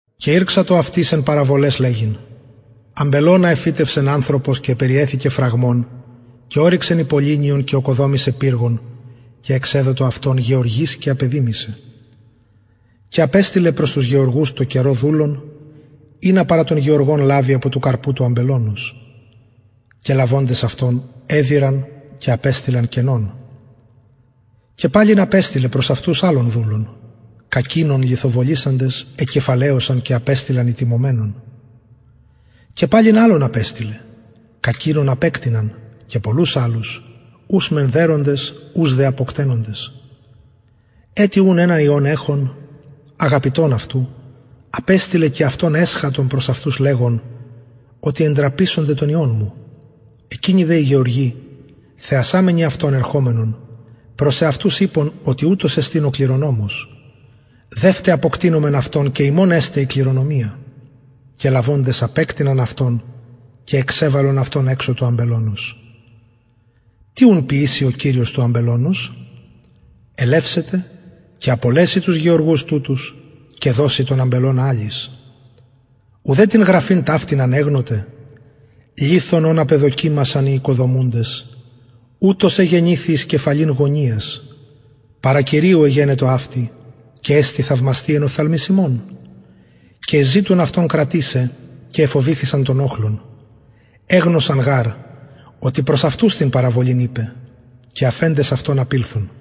και ηρξατο αυτοις εν παραβολαις λεγειν αμπελωνα εφυτευσεν ανθρωπος και περιεθηκεν φραγμον και ωρυξεν υποληνιον και ωκοδομησεν πυργον και εξεδοτο αυτον γεωργοις και απεδημησεν και απεστειλεν προς τους γεωργους τω καιρω δουλον ινα παρα των γεωργων λαβη απο του καρπου του αμπελωνος οι δε λαβοντες αυτον εδειραν και απεστειλαν κενον και παλιν απεστειλεν προς αυτους αλλον δουλον κακεινον λιθοβολησαντες εκεφαλαιωσαν και απεστειλαν ητιμωμενον και παλιν αλλον απεστειλεν κακεινον απεκτειναν και πολλους αλλους τους μεν δεροντες τους δε αποκτενοντες ετι ουν ενα υιον εχων αγαπητον αυτου απεστειλεν και αυτον προς αυτους εσχατον λεγων οτι εντραπησονται τον υιον μου εκεινοι δε οι γεωργοι ειπον προς εαυτους οτι ουτος εστιν ο κληρονομος δευτε αποκτεινωμεν αυτον και ημων εσται η κληρονομια και λαβοντες αυτον απεκτειναν και εξεβαλον εξω του αμπελωνος τι ουν ποιησει ο κυριος του αμπελωνος ελευσεται και απολεσει τους γεωργους και δωσει τον αμπελωνα αλλοις ουδε την γραφην ταυτην ανεγνωτε λιθον ον απεδοκιμασαν οι οικοδομουντες ουτος εγενηθη εις κεφαλην γωνιας παρα κυριου εγενετο αυτη και εστιν θαυμαστη εν οφθαλμοις ημων και εζητουν αυτον κρατησαι και εφοβηθησαν τον οχλον εγνωσαν γαρ οτι προς αυτους την παραβολην ειπεν και αφεντες αυτον απηλθον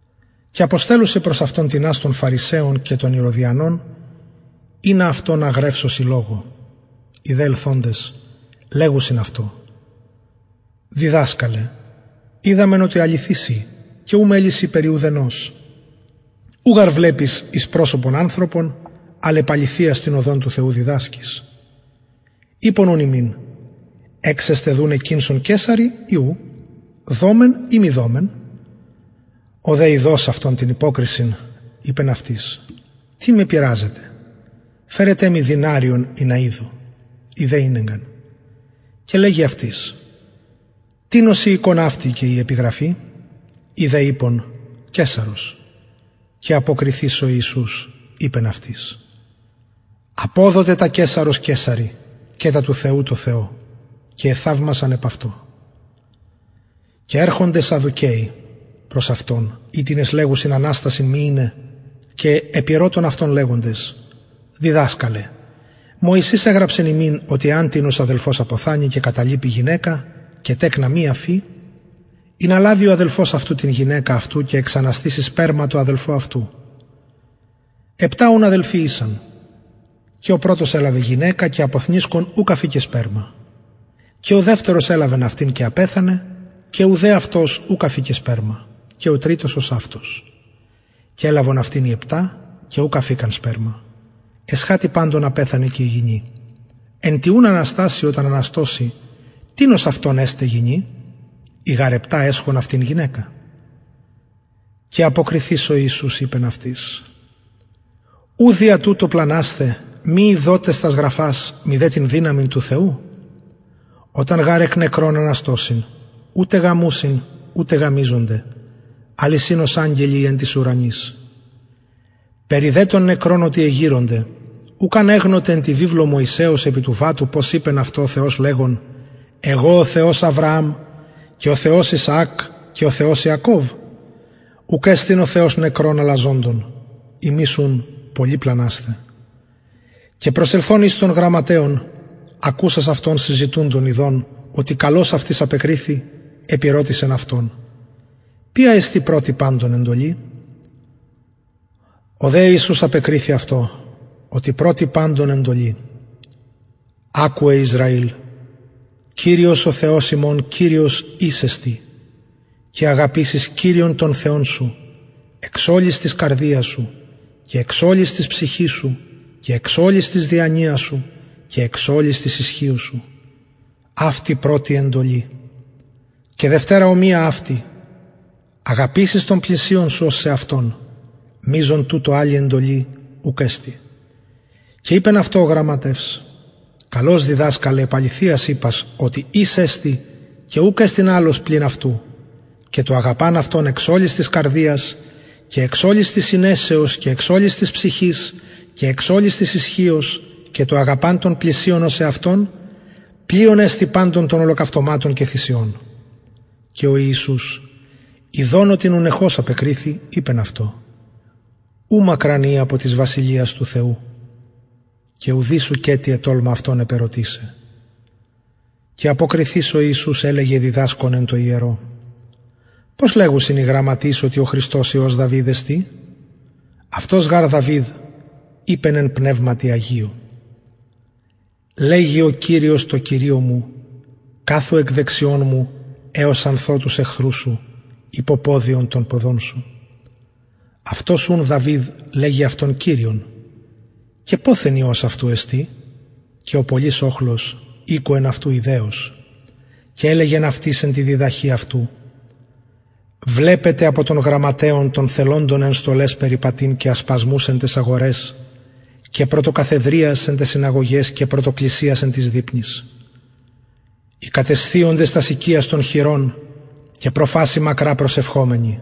και αποστελλουσιν προς αυτον τινας των φαρισαιων και των ηρωδιανων ινα αυτον αγρευσωσιν λογω οι δε ελθοντες λεγουσιν αυτω διδασκαλε οιδαμεν οτι αληθης ει και ου μελει σοι περι ουδενος ου γαρ βλεπεις εις προσωπον ανθρωπων αλλ επ αληθειας την οδον του θεου διδασκεις εξεστιν κηνσον καισαρι δουναι η ου δωμεν η μη δωμεν ο δε ειδως αυτων την υποκρισιν ειπεν αυτοις τι με πειραζετε φερετε μοι δηναριον ινα ιδω οι δε ηνεγκαν και λεγει αυτοις τινος η εικων αυτη και η επιγραφη οι δε ειπον αυτω καισαρος και αποκριθεις ο ιησους ειπεν αυτοις αποδοτε τα καισαρος καισαρι και τα του θεου τω θεω και εθαυμασαν επ αυτω και ερχονται σαδδουκαιοι προς αυτον οιτινες λεγουσιν αναστασιν μη ειναι και επηρωτησαν αυτον λεγοντες διδασκαλε μωσης εγραψεν ημιν οτι εαν τινος αδελφος αποθανη και καταλιπη γυναικα και τεκνα μη αφη ινα λαβη ο αδελφος αυτου την γυναικα αυτου και εξαναστηση σπερμα τω αδελφω αυτου επτα αδελφοι ησαν και ο πρωτος ελαβεν γυναικα και αποθνησκων ουκ αφηκεν σπερμα και ο δευτερος ελαβεν αυτην και απεθανεν και ουδε αυτος αφηκεν σπερμα και ο τριτος ωσαυτως και ελαβον αυτην οι επτα και ουκ αφηκαν σπερμα εσχατη παντων απεθανεν και η γυνη εν τη αναστασει οταν αναστωσιν τινος αυτων εσται γυνη οι γαρ επτα εσχον αυτην γυναικα και αποκριθεις ο ιησους ειπεν αυτοις ου δια τουτο πλανασθε μη ειδοτες τας γραφας μηδε την δυναμιν του θεου οταν γαρ εκ νεκρων αναστωσιν ουτε γαμουσιν ουτε γαμισκονται αλλ εισιν ως αγγελοι οι εν τοις ουρανοις περι δε των νεκρων οτι εγειρονται ουκ ανεγνωτε εν τη βιβλω μωσεως επι του βατου ως ειπεν αυτω ο θεος λεγων εγω ο θεος αβρααμ και ο θεος ισαακ και ο θεος ιακωβ ουκ εστιν ο θεος νεκρων αλλα θεος ζωντων υμεις ουν πολυ πλανασθε και προσελθων εις των γραμματεων ακουσας αυτων συζητουντων ειδως οτι καλως αυτοις απεκριθη επηρωτησεν αυτον ποια εστιν πρωτη παντων εντολη ο δε ιησους απεκριθη αυτω οτι πρωτη παντων των εντολων ακουε ισραηλ κυριος ο θεος ημων κυριος εις εστιν και αγαπησεις κυριον τον θεον σου εξ ολης της καρδιας σου και εξ ολης της ψυχης σου και εξ ολης της διανοιας σου και εξ ολης της ισχυος σου αυτη πρωτη εντολη και δευτερα ομοια αυτη αγαπησεις τον πλησιον σου ως σεαυτον μειζων τουτων αλλη εντολη ουκ εστιν και ειπεν αυτω ο γραμματευς καλως διδασκαλε επ αληθειας ειπας οτι εις εστιν και ουκ εστιν αλλος πλην αυτου και το αγαπαν αυτον εξ ολης της καρδιας και εξ ολης της συνεσεως και εξ ολης της ψυχης και εξ ολης της ισχυος και το αγαπαν τον πλησιον ως εαυτον πλειον εστιν παντων των ολοκαυτωματων και θυσιων και ο ιησους ιδων αυτον οτι νουνεχως απεκριθη ειπεν αυτω ου μακραν ει απο της βασιλειας του θεου και ουδεις ουκετι ετολμα αυτον επερωτησαι και αποκριθεις ο ιησους ελεγεν διδασκων εν τω ιερω πως λεγουσιν οι γραμματεις οτι ο χριστος υιος εστιν δαυιδ αυτος γαρ δαυιδ ειπεν εν πνευματι αγιω λεγει ο κυριος τω κυριω μου καθου εκ δεξιων μου εως αν θω τους εχθρους σου υποποδιον των ποδων σου αυτος ουν δαυιδ λεγει αυτον κυριον και ποθεν υιος αυτου εστιν και ο πολυς οχλος ηκουεν αυτου ηδεως και ελεγεν αυτοις εν τη διδαχη αυτου βλεπετε απο των γραμματεων των θελοντων εν στολαις περιπατειν και ασπασμους εν ταις αγοραις και πρωτοκαθεδριας εν ταις συναγωγαις και πρωτοκλισιας εν τοις δειπνοις οι κατεσθιοντες τας οικιας των χηρων και προφασει μακρα προσευχομενοι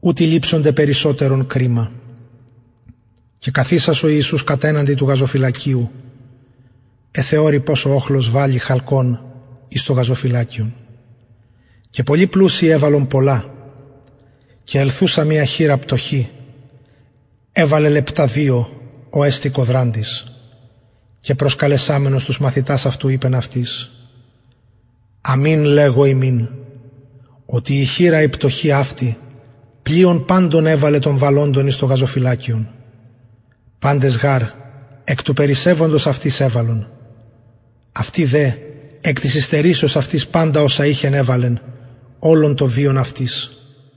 ουτοι ληψονται περισσοτερον κριμα και καθισας ο ιησους κατεναντι του γαζοφυλακιου εθεωρει πως ο οχλος βαλλει χαλκον εις το γαζοφυλακιον και πολλοι πλουσιοι εβαλλον πολλα και ελθουσα μια χηρα πτωχη εβαλεν λεπτα δυο ο εστιν κοδραντης και προσκαλεσαμενος τους μαθητας αυτου λεγει αυτοις αμην λεγω υμιν οτι η χηρα αυτη η πτωχη πλειον παντων βεβληκεν των βαλλοντων εις το γαζοφυλακιον παντες γαρ εκ του περισσευοντος αυτοις εβαλον αυτη δε εκ της υστερησεως αυτης παντα οσα ειχεν εβαλεν ολον τον βιον αυτης